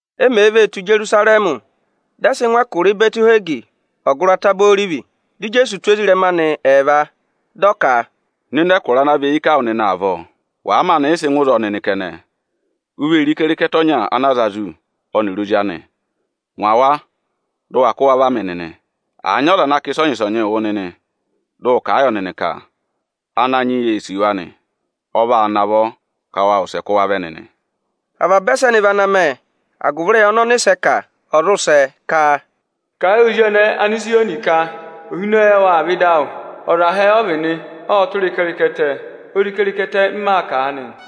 E mèe vee tù Ijerusarẹmị, dị ẹ sị ngụ ẹkụra Ịbẹtị-Ihwegi, ọgụrị Ataba Orivi, Dị Ijeesu tụ́ ezirẹma anị ẹẹva, dị ọ ka, “Nọ ịnị ẹkụra ana và eyi ká wụ nịnị avọọ! Wàa maanị yị sị ngụ ịzọọ nịnị kẹnẹ, u vee re ịkẹrịkẹtẹ ọnya ana a za zù, ọnịrị ozi anị. Ngwa wa, dụ wa kụ́ wa va mị nịnị! Àa nyị ọza ana kà ịsọnyị-ịsọnyịị wụ nịnị, dị ụ kà a yọ nịnị ka: ‘Ananyị yị ee sì wa nị.’ Ọ vaa navọ ka wa wụsẹ kụ́ wa vẹ nịnị.” Avaba ẹsẹnị vị ana mẹ, agụvị ịrẹyị ọnị ọnịsẹ kà, ọ̀ zụ sẹ, ka: “Kà ẹ yị ozi ọnẹẹ Anịzayọnị ka: ‘Ohinọyị awụ aa vẹ ịdị awụ. Ọza hẹẹ ọ vị nị, ộ tụra ịkẹrịkẹtẹ, ozi ịkẹrịkẹtẹ m maa kà aanị nị.’”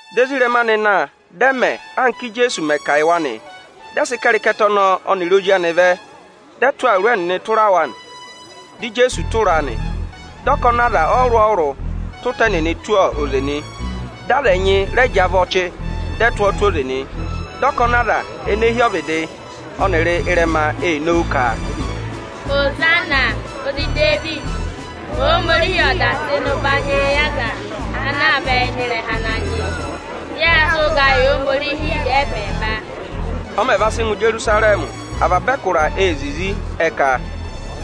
Dị ezirẹma anị na, dị ẹ mẹ, anka Íjeesu mẹ̀ kà a yị wa nị. Dị ẹ sị ịkẹrịkẹtẹ ọnọọ ọnịrị ozi anị vẹ, dị ẹ tụ́ awuru ẹnịnị tụra wa, dị Ijeesu tụra a nị. Dị ọkọnị aza ọrụrụ-ọrụrụ tụ́ ịta ẹnịnị tụ́ oze nị, dị aza ẹnyị rẹ jị avọ́ ọchị, dị ẹ tụ́ ọ tụ́ oze nị. Dị ọkọnị aza ene hi ọvịdị ọnịrị ịrẹma ee nowu ka, “Ihosana! Ozi Idevidi! Ohomorihi ọ̀ dà tụ́ ịnị ụbanyị yị ọza ana aa vẹ ịnị ịrẹha Ananyị yị. Yâ sị ụga yị Ohomorihi ẹbẹẹba!” Ọ mẹ̀ va sị ngụ Ijerusarẹmị, avaba ẹkụra ee zizi. Ẹ ka,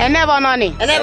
“Ẹnẹ vị ọnọnị kẹ?”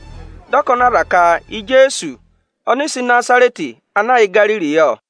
Dị ọkọnị aza ka Ijeesu, ọnịsẹ Ịnazarẹtị ana yà Igariri yọ.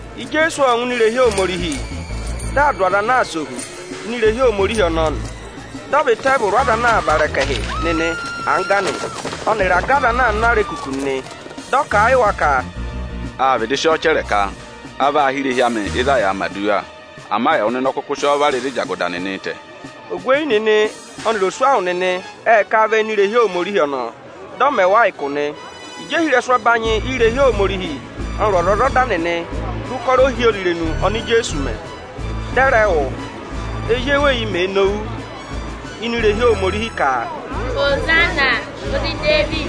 Ijeesu ộ ngụ ini irehi Ohomorihi, dị aa dụ aza ana aa sẹ ohu ini irehi Ohomorihi ọnọọ nị. Dị ọ và iteevuru ọza anaā vara ẹkẹhị nịnị angga nị, ọnịrị aga aza anaā ná arekuku nịnị. Dị ọ kà a yị wa ka, “Â vịdị sị ọọ chẹrẹ ka: ‘A vaa hị́ irehi amị ịzị a yàā mẹ̀ aduwa.’ Ama ẹwụ nịnị ọ kụkụ sị ọọ vara ịzị ịjagụda nịnịị̄ tẹ̀.” Ogweyi nịnị ọnịrị oswahụ nịnị ệ kà vẹ ini irehi Ohomorihi ọnọọ, dị ọ mẹ wa ụkụ nị. Ịjị ohirẹsụ ẹbanyị irehi Ohomorihi ọnịrị ọzwọzọda nịnị re ụkọrọ ohyozirenu oni Ijeesu mẹ, dị ẹ rẹ wụ́, ezi eweyi mèe nowu ini irehi Ohomorihi ka, “Ihosana, ozi Idevidi”,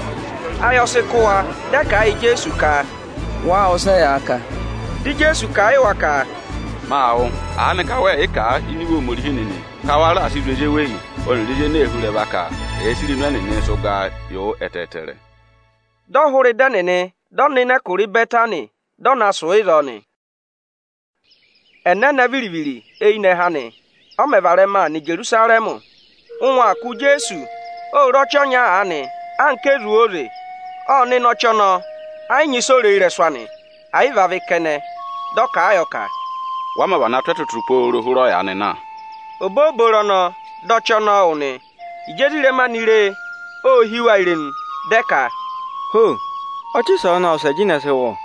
ayị ọ sị kụ́ wa. Dị ẹ kà a yị Ijeesu ka, “Wáá wụ́ ịsị ẹyaa kà?” Dị Ijeesu kà a yị wa ka, “Maa wụ́. Aanịka wẹẹ̀ yị kà a ini Iwe Ohomorihi nịnị ka, ‘Wa raà sị zụ̀ ezi eweyi ọnịrị ezi ene ee hú ịrẹva ka ẹ̀ẹ sị irenu ẹnịnịị sị ụgaa yị wụ ẹtẹẹtẹrẹ.’” Dị ọ hụrẹ ịdị ẹnịnị, dị ọ nọ ịnị ẹkụra Ịbẹtanị, dị ọ na sụ̀ ịzọọ nị. Ẹnẹnẹ viri-viri eyinẹhẹ anị, ọ mẹ̀ varẹma aa nọ Ijerusarẹmị, ụngwẹ aa kụ̀ Ijeesu, Ô re ọchị ọnya aanị anka ọchị ezu óze. Ộ nọ ịnị ọchị ọnọọ, ẹ yị nyị ịsị o re ị́rẹsụ anị, ẹ̀ yị vị avị kẹnẹ. Dị ọ kà a yọ ka, “Wa mā vana tụ́ ẹtụtụ pooro hụrẹ ọyaanị na.” Obooboro ọnọọ, dị ọchị ọnọọ wụ nị. Ịjị ezirẹma anị re e, ô hí wa irenu, dị ẹ ka, “Ho! Ọchị ịsọọnị ộ wụsẹ jịnẹ sị wụ, ọ!”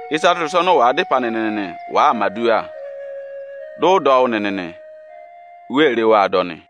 Ịsa tụra ịsa ọnị ụ wàa dá ịpẹ anị nịnị wàaa mẹ̀ aduwa, dị ụ dọ wụ́ nịnị nị, u wee re waa dọ nị.”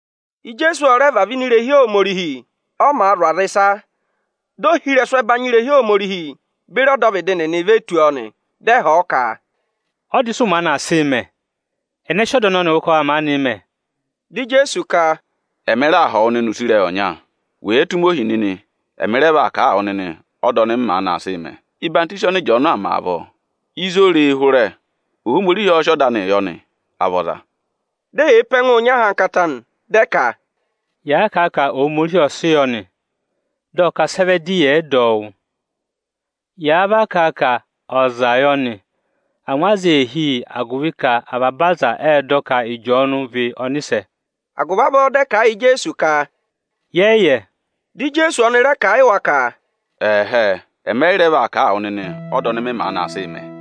Ijeesu ọ rẹ vavẹ ini irehi Ohomorihi. Ọ màa zụ̀ aza ịsa, dị ohirẹsụ ẹbanyị irehi Ohomorihi beri ọdọvịdị nịnị ve tù ọọ nị. Dị ẹ họ̀ ọ ka, “Ọda ịsị ụ maanị aa sịị mẹ? Ẹnẹ sị ọda ọnọnịị wụ ka wa maanịị mẹ?” Dị Ijeesu ka, “Ẹmị raa họ̀ wụ nịnị use ịrẹyị ọnya. Wèe tụ́ mị ohi nịnị, ẹmị rẹ vaa kà a wụ nịnị ọda ọnị mị maanị aa sịị mẹ: Ọyịhwọzenyi ọnị Ịjọọnụ aa mẹ avọọ, ịzị o re e hụrẹ? Ohomorihi ọ́ọ́ sị ọda anịị yọ nị, à vị ọza?” Dị eyee pe ẹngụụ nyị ahankata nị, dị ẹ ka, “Yàa kà a ka Ohomorihi ọ sị yọ nị, dị ọ ka sị ẹ vẹ dị ẹyị ẹ̀ yị dọ ọ wụ́? Ị yáá vaa kà a ka ọza yọ nị? Angwa aza ee hí yị, agụvị ka avaba aza ệ dọ ka Ịjọọnụ vị ọnịsẹ.” Agụvị avọọ dị ẹ kà a yị Ijeesu ka, “Yẹ yị yẹ.” Dị Ijeesu ọnị rẹ kà a yị wa ka, “Ẹ̀hẹẹ, ẹmị ẹ yị rẹ vaa kà a wụ nịnị ọda ọnị mị maanị aa sịị mẹ.”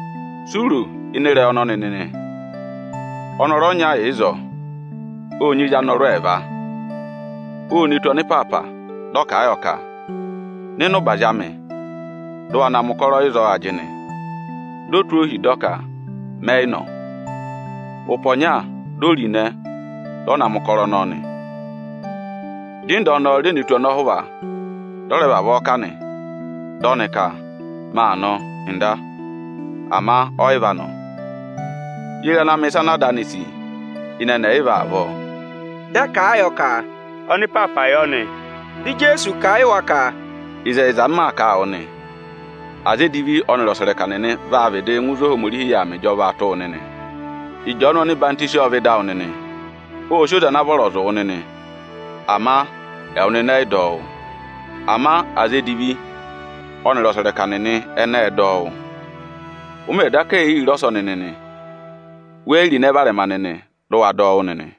“Si u ro ịnị ịrẹyị ọnọnị nịnị? Ọnọrụ ọnya yà ịzọọ, ộ nyị ezi anọrụ ẹẹva. O ne tù ọnịpaapa, dị ọ kà a yọ ka: ‘Nọ ịnị ụbazị amị, dị ụ wa na mẹ̀ ụkọrọ ịzọọ ajịnị!’ Di o tụ́ ohi, dị ọ ka: ‘Mẹ yị nọ nị.’ Ụpẹ ọnya, di o ro ịnẹ, dị ọ na mẹ̀ ụkọrọ ọnọọ nị. Dị ịnda ọnọọ re ne tù ọnọhụva, dị ọ rẹ vavọọ kà nị. Dị ọnị ka: ‘Maa nọ, Ọga’, ama ọ yị va nọ. Ye re ana mẹ̀ ịsa ana ada anị sì ịnị ẹnị ẹyịva avọọ?” Dị ẹ kà a yọ ka, “Ọnịpaapa yọ nị.” Dị Ijeesu kà a yị wa ka, “Ịzẹyịza m maa kà a wụ nị: Aza edivi ọnịrị ọsẹrẹka nịnị vaa vịdịị ngụ ịzị Ohomorihi yà aa mẹ ịjọvaa tụ́ wụ nịnị. Ịjọọnụ ọhwọzenyi ộ vẹ ịdị awụ nịnị, ộ sị oze ana vọrọ zụ̀ wụ nịnị; ama ẹwụ nịnị ẹ yị dọ ọ wụ́. Ama aza edivi ọnịrị ọsẹrẹka nịnị ẹnị ệ dọ ọ wụ́. Ụ mẹ̀ daka yi re ọsọnị nịnị, we yi ro ịnẹ varẹma nịnị dị ụ wa dọ wụ́ nịnị.”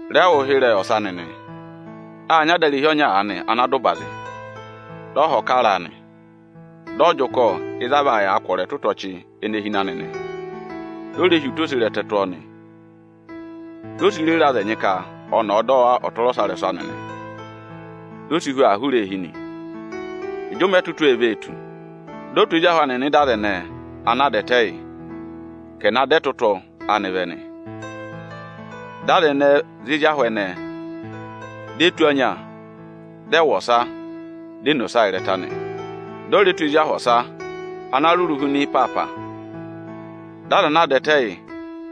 “Re wụ́ ụhịrẹyị ọsa nịnị! Â nyị adarehi ọnya aanị ana dà ụbazị, dị ọ họ̀ kara a nị. Dị ọ jị ụkọ ịzị a vaa yàa kwọrọ ẹtụtụ ọchị ene hi ịnị anị nị. Di o re hi ụta oserẹtẹ tụ́ ọọ nị. Di o si rere aza ẹnyị ka ọnị ọ̀ọ dọ wa ọtụrọsarẹsụ anị nị. Di o si hu aa hụrẹ eehi nị. Ịjị ụmẹ ẹtụtụ ee vee tù, dị ọ tụ́ ezi ahụ anị nọ ịda aza ẹnẹ ana a dà ẹtẹ yị, ka ẹ̀ na dọ ẹtụtụ anị vẹ nị. Dị aza ẹnẹẹ za ezi ahụ ẹnẹẹ, di e tụ́ ọnya, dị ẹ wụ ọsa; di e ne ọsa ịrẹta nị. Dị ọ rẹ tụ́ ezi ahụ ọsa ana rụrụ huna ị́ịpaapa, dị aza ana a dà ẹtẹ yị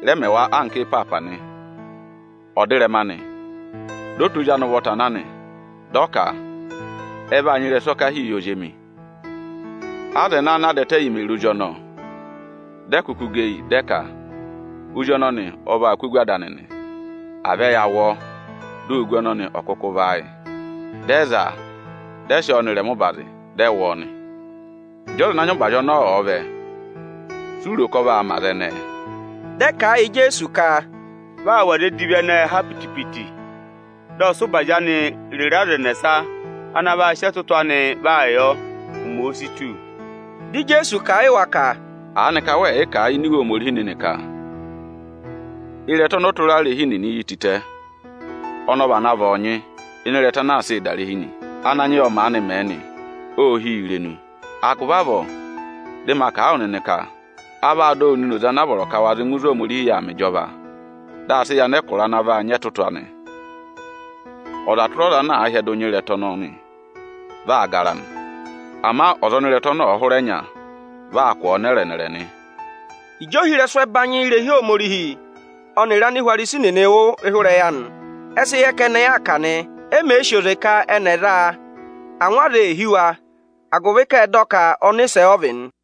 rẹ mẹ wa anka ịpaapa nị. Ọdịrẹma anị, dị ọ tụ́ ozi anị ụvọta na nị. Dị ọ ka: ‘Ẹ vaa nyị ịrẹsụ ọkahii yị ozi emi.’ Aza ẹnẹẹ ana a dà ẹtẹ yị mè re ozi ọnọọ, dị ẹ kụkụ gẹ eyi, dị ẹ ka, ‘Ozi ọnọnị ọ vaa kụ́ ogu ada anị nị; à vẹ ya wụ ọọ, di ogu anị ọ̀ kụkụ vị áayị!’ Dị ẹ za a, dị ẹ sị ọọ nọ ịrẹma ụbazị, dị ẹ wụ̀ ọ nị. “Ịjị ọza ana nyị ụbazị ọnọọ ọ̀ọ vẹ, si u ro ka ọ vaa mẹ aza ẹnẹẹ?” Dị ẹ kà a yị Ijeesu ka, “Vị aa wụ̀ aza edivi ẹnẹẹ ha piti-piti, dị ọ sị ụbazị anị rere aza ẹnẹsa ana vaa sị ẹtụtụ anịị vaa yọ, ụmẹ òo si tù nị.” Dị Ijeesu kà a yị wa ka, “Aanịka wẹẹ̀ yị kà a ini Iwe Ohomorihi nịnị ka: ‘Ịrẹta ọnị ọtụrarehi nịnị yi tịtẹ, ọnị ọ vana vị ọọnyị ịnị ịrẹta anaa sịị̄ dà irehi nị. Ananyị yị ọ maanị mẹ nị, ô hí yi irenu!’ Agụvị avọọ, dị ma kà a wụ nịnị ka a vaa dọ wụ nịnị oze anaa vọrọ ka wa zị ngụ ịzị Ohomorihi yà aa mẹ ịjọva, dị a sị yị anẹkụra ana vaa nyị ẹtụtụ anị. [Ọza tụra ọza ana àa hyẹdụ nya ịrẹta ọnọnị, vị aa gara nị. Ama ọza ọnị ịrẹta ọnọọ ọ̀ọ hụrẹ nya, vị aa kwọ̀ ọ nẹrẹ-nẹrẹ nị.”] Ịjị ohirẹsụ ẹbanyị irehi Ohomorihi ọnịrị Anihwarisi nịnị wụ́ ụhịrẹyị anị, ẹ sị yẹ ka ẹnị aa kà nị. E mèe sì oze ka ẹnị ẹ̀ za a, angwa aza ee hí wa, agụvị ka ệ dọ ka ọnịsẹ ọ vị nị.